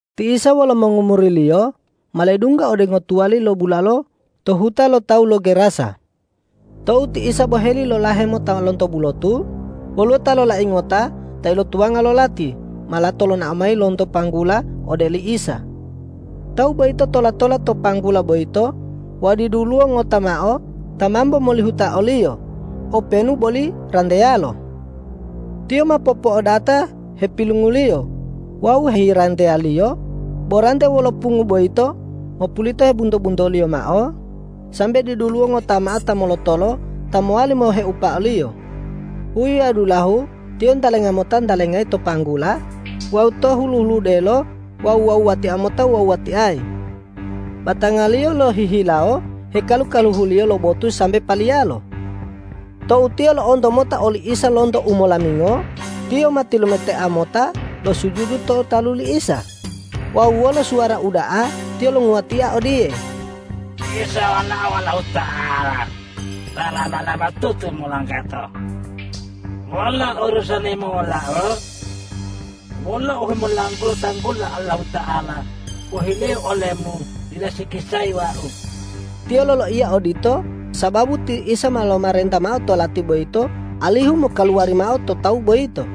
Ti Isa wolo mongomuri-Liyo ma ledungga ode ngotuwali lo bulalo to huta lo tawu lo Gerasa. Tou ti Isa boheli lolahe mota lonto bulotu, woluwo ta lolai ngota ta ilotuwanga lo lati ma lato lonao mayi lonto panggula ode li Isa. Tawu boyito tola-tola to panggula boyito wawu diduluwo ngota mao ta mambo molihuta oliyo, openu boli ranteyalo. Tiyo ma po'opo'odata hepilunguliyo wawu heyiranteyaliyo, bo rante wolo pungu boyito mopulito hebunto-buntoliyo mao, sambe diduluwo ngota mao ta molotolo ta mowali moheupa oliyo. Huyi wawu dulahu tiyo ntalenga mota ntalengayi to panggula wawu to hulu-huludelo wawu wuwatia mota wuwatiayi. Batangaliyo lohihilawo hekalu-kaluhuliyo lo botu sambe paliyalo. Tou tiyo lo'onto mota oli Isa lonto umolamingo, tiyo ma tilumetea mota losujudu to talu li Isa wawu wolo suwara uda'a tiyo longuwatia odiye,”Isa Walao Allahuta'ala ta laba-labatutu molanggato! Wolo urusani-Mu wolau? Wolo uhemolanggula tanggulo Allahuta'ala pohileu ole-Mu dila sikisayi wau.” Tiyo loloiya odito sababu ti Isa ma lomarenta mao to lati boyito alihu mokaluwari mao to tawu boyito.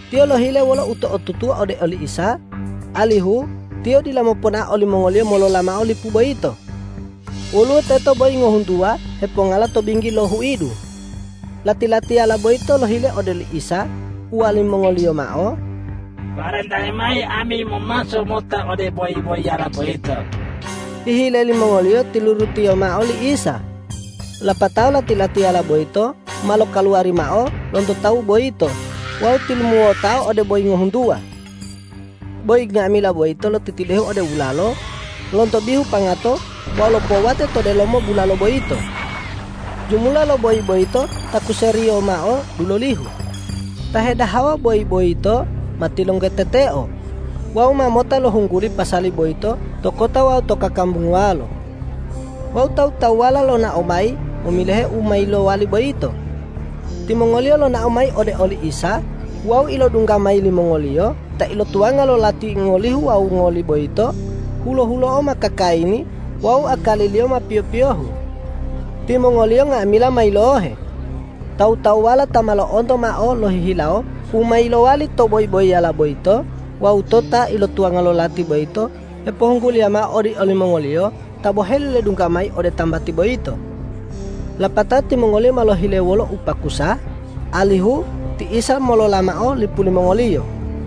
Tiyo lohile wolo uto'otutuwa ode oli Isa, alihu Tiyo dila moponao olimongoliyo molola mao lipu boyito. Woluwo teto boyi ngohuntuwa hepongala to binggi lo huidu. Lati-latiyala boyito lohile ode oli Isa, uwalimongoliyo mao,”Parentayi mayi ami momaso mota ode boyi-boyiyala boyito.” Hihile limongoliyo tilurutiya mao li Isa. Lapatao lati-latiyala boyito ma lokaluwari mao lonto tawu boyito wawu tilumuwotao ode boyi ngohuntuwa. Boyi nga'amila boyito lotitidehu ode bulalo lonto bihu pangato wawu lopowate to delomo bulalo boyito. Jumula lo boyi boyito takuseriyo mao dulolihu. Ta hedahawa boyi boyito ma tilonggoteteo wawu ma mota lohungguli pasali boyito to kota wawu to kakambunguwalo. Wawu tawu-tawuwala lonao mayi momilohe u ma yilowali boyito. Timongoliyo lonao mayi ode oli Isa wawu ilodungga mayi limongoliyo ta ilotuwanga lo lati ngolihu wawu ngoli boyito hulo-hulo'o ma kakayini wawu akaliliyo ma piyo-piyohu. Timongoliyo nga'amila ma yilohe. Tawu-tawuwala ta ma lo'onto mao lohihilawo u ma yilowali to boyi-boyiyala boyito wawu to ta ilotuwanga lo lati boyito hepohungguliya mao ode olimongoliyo ta boheli ledungga mayi ode tambati boyito. Lapatao timongoliyo ma lohile wolo upakusa, alihu ti Isa molola mao lipu limongoliyo.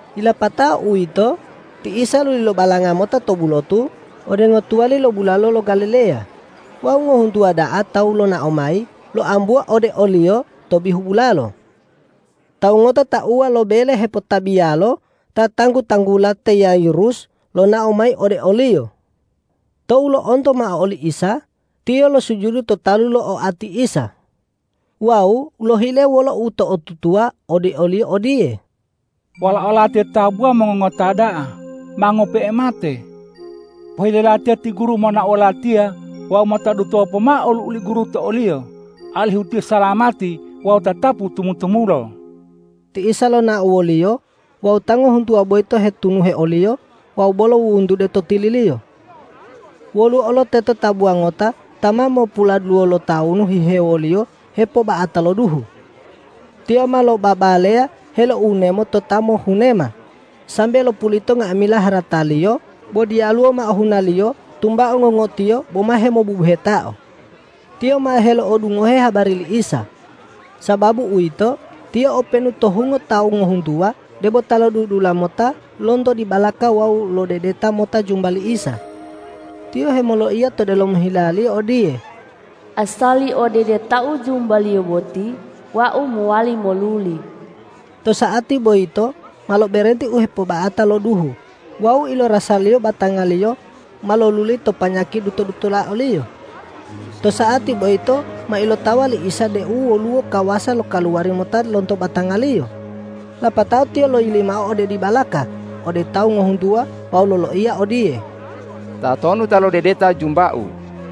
Yilapato uwito, ti Isa luli lobalanga mota to bulotu ode ngotuwali lo bulalo lo Galileya wawu ngohuntuwa da'a tawu lonao mayi loambuwa ode o-Liyo to bihu bulalo. Tawu ngota tauwa lo bele hepotabiyalo ta tanggu-tanggula te Yairus lonao mayi ode o-Liyo. Tou lo'onto mao oli Isa, tiyo losujudu to talu lo oati Isa wawu lohile wolo uto'otutuwa ode o-Liyo odiye,”Walao latiya tabuwa mongongota da'a, ma ngope'e mate. Pohile latiya ti Guru monao wolatiya wawu mota dutuwa pomao olu'u li Guru to oliyo, alihu tiyo salamati wawu tatapu tumu-tumulo.” Ti Isa lonao woliyo wawu ta ngohuntuwa boyito hetunuhe o-Liyo wawu bolo wuwuntude to tili-Liyo. Woluwo olo teto tabuwa ngota ta ma mopuladuluwo lo tawunu hihewoliyo hepoba'ata lo duhu. Tiyo ma lobabaleya heloiwunemo to ta mohunema, sambe lopulito nga'amila harataliyo, bo diyaluwo mao hunaliyo tumbao ngongotiyo boma hemobubuhetao. Tiyo ma helo'odungohe habari li Isa. Sababu uwito, tiyo openu to hungo tawu ngohuntuwa debo ta lodudula mota lonto dibalaka wawu lodedeta mota jumba li Isa. Tiyo hemoloiya to delomo hilaliyo odiye,”Asali odedetau jumba-Liyo boti wau mowali moluli.” To sa'ati boyito ma loberenti u hepoba'ata lo duhu wawu ilorasaliyo batangaliyo ma loluli to panyaki duto-dutola oliyo. To sa'ati boyito ma ilotawa li Isa deu woluwo kawasa lokaluwari mota lonto batanga-Liyo. Lapatao Tiyo loyili mao ode dibalaka ode tawu ngohuntuwa wawu loloiya odiye,”Tatonu ta lodedeta jumba-U?”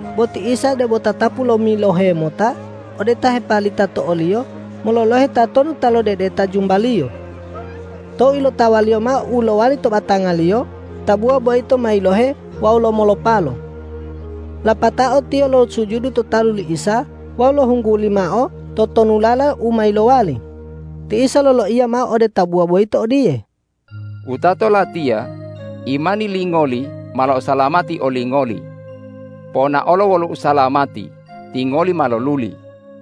Bo ti Isa debo tatapu lomilohe mota ode ta hepalita to o-Liyo mololohe tatonu ta lodedeta jumba-Liyo. Tou ilotawaliyo mao u ma lowali to batangaliyo, tabuwa boyito ma yilohe wawu lomolopalo. Lapatao tiyo losujudu to talu li Isa wawu lohungguli mao totonulala u ma yilowali. Ti Isa loloiya mao ode tabuwa boyito odiye,”Wutato Latiya, imani lingoli ma lo'osalamati olingoli. Ponaolo wolo usalamati, tingoli ma loluli!”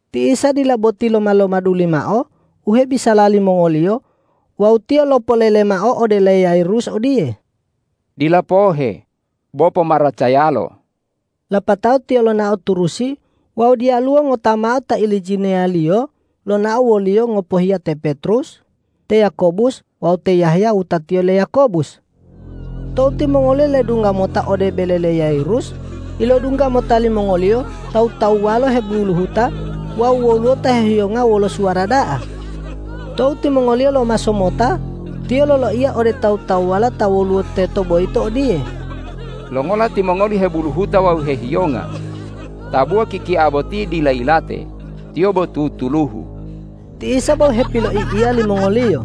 Ti Isa dila boti loma-lomaduli mao u hebisala limongoliyo wawu Tiyo lopolele mao ode le Yairus odiye,”Dila pohe, bo pomaracayalo.” Lapatao Tiyo lonao turusi wawu diyalu ngota mao ta ilijiniya-Liyo lonao wo-Liyo ngopohiya te Petrus, te Yakobus wawu te Yahya wutatiyo le Yakobus. Tou timongoliyo ledungga mota ode bele le Yairus, ilodungga mota limongoliyo tawu-tawuwalo hebuluhuta wawu woluwo ta hehiyonga wolo suwara da'a. Tou timongoliyo ma lomaso mota, Tiyo loloiya ode tawu-tawuwala ta woluwo teto boyito odiye,”Longola timongoli hebuluhuta wawu hehiyonga? Tabuwa kikia boti dila yilate, tiyo bo tutuluhu!” Ti Isa bo hepiloi'iya limongoliyo.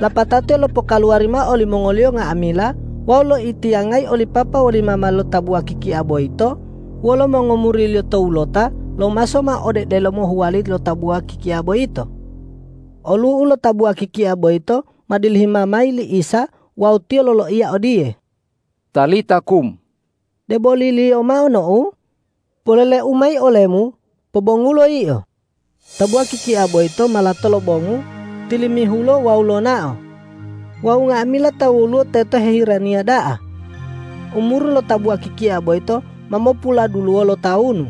Lapatao Tiyo lopokaluwari mao olimongoliyo nga'amila wawu loitiyangayi oli papa woli mama lo tabuwa kikia boyito wolo mongomuri-Liyo towulota lomaso mao ode delomo huwali lo tabuwa kikia boyito. Olu'u lo tabuwa kikia boyito ma dilihima mayi li Isa wawu Tiyo loloiya odiye,”Talita kum,” deboliliyo mao nou, polele-U mayi olemu: Pobongulo yio! Tabuwa kikia boyito ma lato lobongu, tilimihulo wawu lonao. Wawu nga'amila ta woluwo teto hiheraniya da'a. Umuru lo tabuwa kikia boyito ma mopuladuluwo lo tawunu.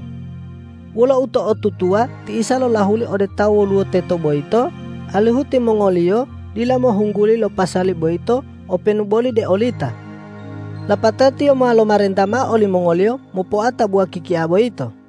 Wolo uto'otutuwa ti Isa lolahuli ode ta woluwo teto boyito alihu timongoliyo dila mohungguli lo pasali boyito openu boli de olita. Lapatao Tiyo ma lomarenta mao olimongoliyo mopoa tabuwa kikia boyito.